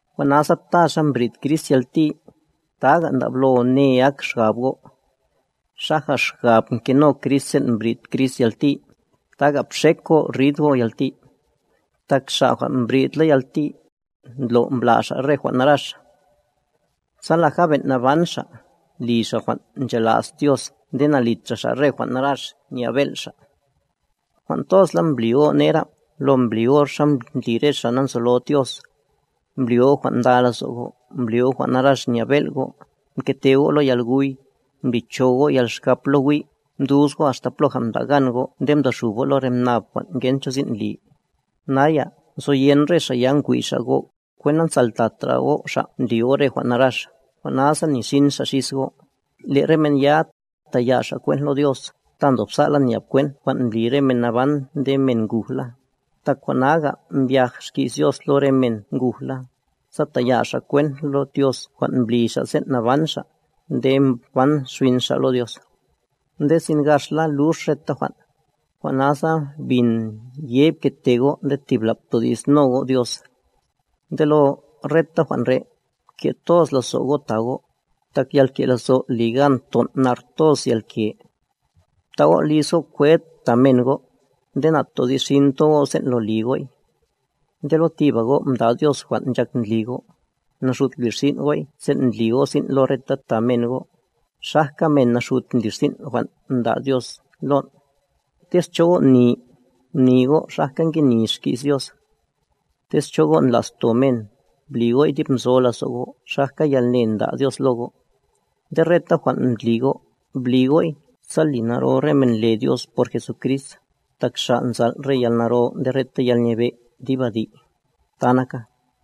Jwan' nasa ta xa mbrid Crist yalti, taga' ndablo ne ak xgab go', xaja xgab mkeno Crist sen' mbrid Crist yalti, taga' bxek go' rid go' yalti. Tak xa' jwan' mbridla yalti, ndlo' mbla' xa' re jwan' narax. Sa laja ben' naban xa', li xa jwan' nchola's Dios nde na'litra xa' re jwan' narax nya'b bel' xa'. Jwan' tozla mbli go' nera, lo mbli go' xa ndli re xa' nanzolod Dios. Mbli go' jwan' nda lazo' go', mbli go' jwan' narax nya'b bel' go', mkete go' lo yalguy, mblicho go' yalxkap lo wi', mdus go' axta ploja mda' gan go' nde mdoxub go' re lo mnab jwan' ngen cho sin' li. Naya, nzoyen re xa' ya ngwi' xa' go' kwent nanzaltatra go' xa' li go' re jwan' narax, jwan' nasa nixin xa' xis go'. Le' re men ya, ta'ya' xa' kwent lo Dios, ta ndobsa'la nya'b kwent jwan' mbli re men naban nde men ngujla. Tak jwan' naga mbyaj xki's Dios lo re men ngujla, sa taya' xa' kwent lo Dios jwan' mbli xa' sen' naban xa', nde ban xbin xa' lo Dios. Ndesin gaxla lux reta jwan'. Jwan' nasa bin ye pkete go' nde tibla' ptodi'sno go' Dios. Nde lo reta jwan' re', pke' toz lazo' go' ta go', tak yalke' lazo' li gan ton' nar toz yalke. Bta' go' liz go' kwed ta men go', nde na'todi'sxinta go' sen' lo li go'y. Nde lo tiba go' mda' Dios jwan' nchak ndli go', naxut blirsin' go'y sen' ndli go' sin' lo reta ta men go', xajka men naxut ndlirsin' jwan' mda' Dios lon'. Tez cho go' ni, mni go' xajka nge ni xki's Dios. Tez cho go' ndla'sto men, bli go'y dib nzo lazo' go' xajka yalne nda' Dios lo go'. Nde reta jwan' ndli go', bli go'y, sa li naro re men le Dios por Jesucrist, tak Xa' nzal' re yalnaro nde reta yalnyebe', dib adi'. Ta naka.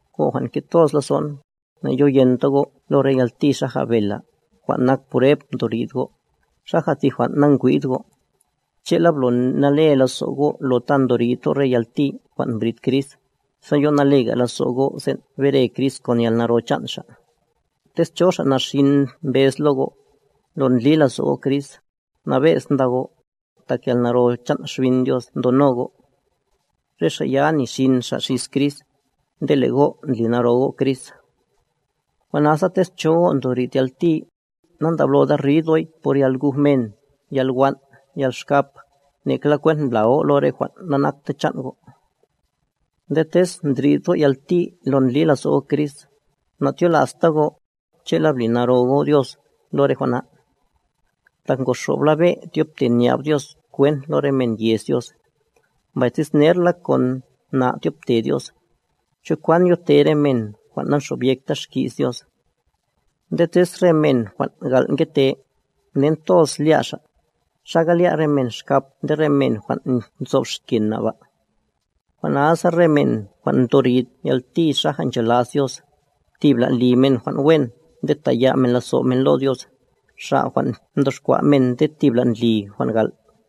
Go' jwan' nke' toz lazo'n, na'yoyenta go' lo re yalti xaja bela, jwan' nak prueb ndo rid go', xaja ti jwan' nangwi'd go'. Che'la, blo nale lazo' go' lo ta ndo rid go' re yalti jwan' mbrid Crist, sa yo nalega lazo' go' sen' bere Crist kon yalnaro chan' Xa'. Tez cho xa' naxin mbez lo go', lo ndli lazo' go' Crist, nabe'z nda go', tak yalnaro chan' Xbin Dios ndono go'. Re xa' ya nixin xa' xis Crist, nde le' go' ndli naro go' Crist. Jwan' nasa, tez cho go' ndorid yalti, nandabloda rid go'y por yalguj men, yalwan', yalxkap, nekla kwent mbla go' lo re jwan' nanakta chan' go'. Nde tez ndrid go' yalti lo ndli lazo' go' Crist, na'tyola'sta go', che'la bli naro go' Dios, lo re jwan' na. Tak ngoxobla be' tyobte nya'b Dios kwent lo re men yez Dios, mbay tez nerla kon na' tyobte Dios, ¿cho kwan yote re men jwan' nanxobyekta xki's Dios? Nde tez re men jwan' gal' ngete, nen toz lya' xa', ¿xaga lya' re men xkap nde re men jwan' nzob xken na' ba? Jwan' nasa re men jwan' ndo rid yalti xaja nchola's Dios, tibla' li men jwan' wen nde ta'ya' men lazo' men lo Dios, Xa' jwan' mdoxkwa' men nde thibla' ndli jwan' gal'.